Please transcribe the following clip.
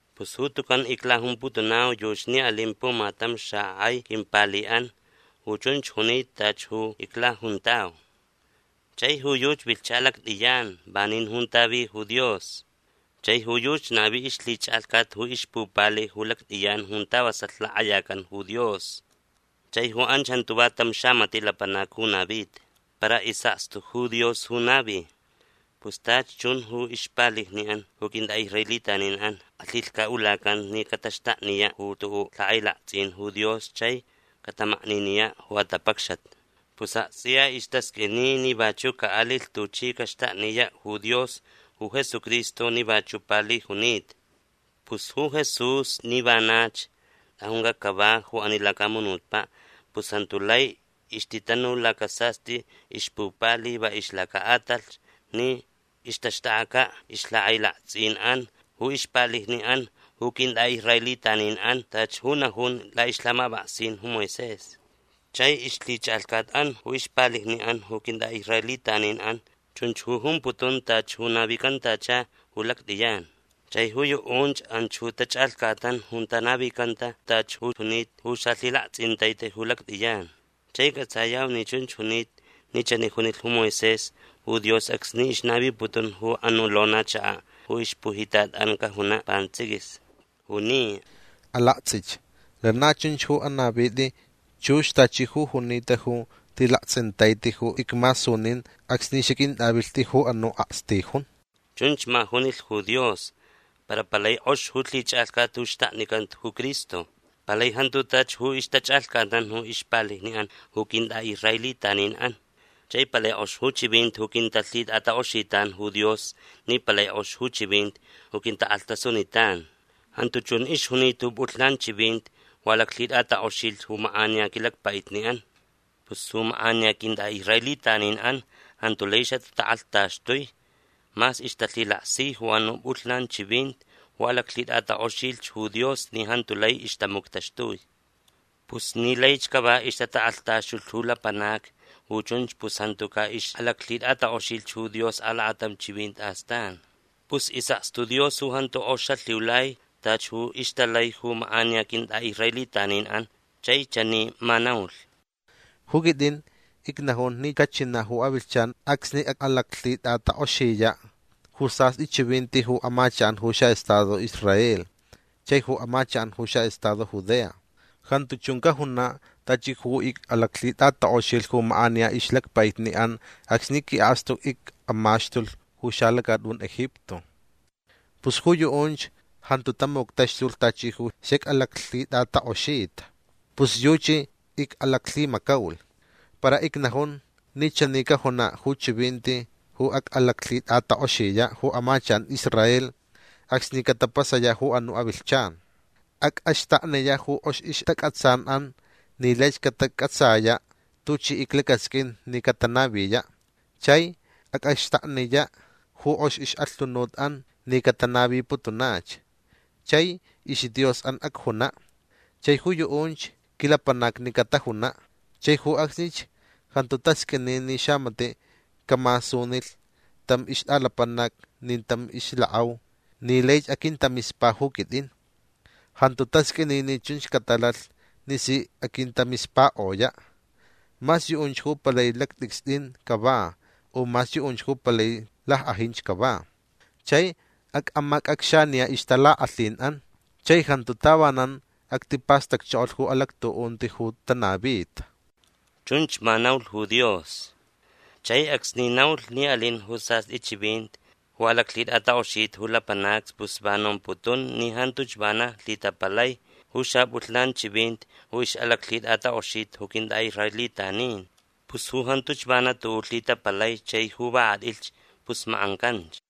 Pus ju tucan iclajumputunau yuchi ni alin pumatam xakʼai quimpaliʼan ju chunch junita tachi ju iclajuntau. Chai ju yuchi vilhcha lactʼiyan vanin junta vi ju Dios. Chai ju yuchi navi ixlhichʼalhcat ju ixpupali ju lactʼiyan junta vasalh lakʼayacan ju Dios. Chai ju anch jantu va tam xamatiʼ lapanac ju navita. Para isʼakstu ju Dios ju navilh. Pus tachi chun ju ixpalijniʼan ju quintʼaʼisraelitaninʼan alhilhcaʼulacanta ni cataxtakniyaʼ ju tuʼuʼ lhakʼailaktsʼin ju Dios chai catamakniniyaʼ ju atapacxat. Pus aktsʼiya istasqʼuini ni vachuʼ caʼalilh tuchi caxtakniyaʼ ju Dios ju Jesucristo ni vachuʼ pali junita. Pus ju Jesús ni vanach tʼajuncaʼ cava ju ani lacamunutpaʼ pus jantu lai ixtitanu laca sastʼi ixpupali va ixlacaʼatalh ni ixtaxtʼakʼacaʼ ixlhakʼailaktsʼinʼan ju ixpalijniʼan ju quintʼaʼisraelitaninʼan tachi ju najun laʼixlhamapʼaksin ju Moisés. Chai ixlhichʼalhcatʼan ju ixpalijniʼan ju quintʼaʼisraelitaninʼan chunch ju jumputun tachi ju navicantacha ju lactʼiyan. Chai ju yuʼunch anch ju tachʼalhcatnan junta navicanta tachi ju junita ju xalhilaktsʼintaiti ju lactʼiyan. Chai cʼatsayau ni chunch junita ni chani junilh ju Moisés ju Dios acsni ixnaviputun ju anuʼ lonachakaʼ ju ixpujitatʼan cajunaʼ pantsʼiquis. Juni: “Alaktsʼich. Lana chunch ju anavitʼi chux tachi ju junita ju lhilaktsʼintaiti ju icmasunin acsni xaquintʼavilhtʼi ju anuʼ akstijun”. Chunch ma junilh ju Dios. Para palai kʼox ju lhichʼalhcat ju xtaknicanta ju Cristo. Palai jantu tachi ju ixtachʼalhcatnan ju ixpalijniʼan ju quintʼaʼisraelitaninʼan. Chai palai kʼox ju chivinti ju quintalhitʼatakʼoxitan ju Dios ni palai kʼox ju chivinti ju quintakʼalhtasunitan. Jantu chun ixjunita ju pʼulhnan chivinti ju alaclhitʼatakʼoxilh ju makʼaniya quilacpaʼitniʼan. Pus ju makʼaniya quintʼaʼisraelitaninʼan jantu lai xatatakʼalhtaxtui mas ixtalhilaksi ju anuʼ pʼulhnan chivinti ju alaclhitʼatakʼoxilh ju Dios ni jantu lai ixtamuctaxtui. Pus ni laich cava ixtatakʼalhtaxtulh ju lapanacni ju chunch pus jantu caʼixʼalaclhitʼatakʼoxilh ju Dios alakatam chivinti astan. Pus isʼakstu Dios ju jantu kʼox xalhiulai tachi ju ixtalai ju makʼaniya quintʼaʼisraelitaninʼan. Chai chani ma naulh: Ju quitʼin icnajun ni cachinaʼ ju avilhchan acsni acʼalaclhitʼatakʼoxiyaʼ ju sastʼi chivinti ju amachakʼan ju xaʼestado Israel chai ju amachakʼan ju xaʼestado Judea. Jantu chun cajunaʼ tachi ju icʼalaclhitʼatakʼoxilh ju makʼaniya ixlacpaiʼan acsni quiʼakstu icʼamaxtulh ju xalacatʼun Egipto. Pus ju yuʼunch jantu tamuctaxtulh tachi ju xacʼalaclhitʼatakʼoxita. Pus yuchi icʼalaclhimacaulh. Para icnajun ni chani cajunaʼ ju chivinti ju acʼalaclhitʼatakʼoxiyaʼ ju amachakʼan Israel acsni catapasayaʼ ju anuʼ avilhchan. Acʼaxtakniyaʼ ju kʼox ixtacʼatsanʼan ni laich catacʼatsayaʼ tuchi iclacasqʼuin ni catanaviyaʼ. Chai acʼaxtakniyaʼ ju kʼox ixʼalhunutʼan ni catanaviputunach. Chai isDiosʼan acjunaʼ. Chai ju yuʼunch quilapanacni catajunaʼ. Chai ju acsnich jantu tasqʼuini ni xamatiʼ camasunilh tam ixtʼalapanac nin tam ixlakʼau ni laich aquintamispa ju quitʼin. Jantu tasqʼuini ni chunch catalalh ni si aquintamispakʼoyaʼ. Mas yuʼunch ju palai lactʼicstʼin cava u mas yuʼunch ju palai lackʼajinch cava. Chai acʼamacʼacxaniyaʼ ixtalakʼalhinʼan. Chai jantu tavanan actipastacchokolh ju alactuʼunti ju tanavita. Chunch ma naulh ju Dios. Chai acsni naulh ni alin ju sastʼi chivinti ju alaclhitʼatakʼoxita ju lapanacni pus va nomputun ni jantuch vana lhitapalai ju xapʼulhnan chivinti ju ixʼalaclhitʼatakʼoxita ju quintʼaʼisraelitanin. Pus ju jantuch vana tuʼuʼ lhitapalai chai ju va kʼatʼilh pus makʼancanch.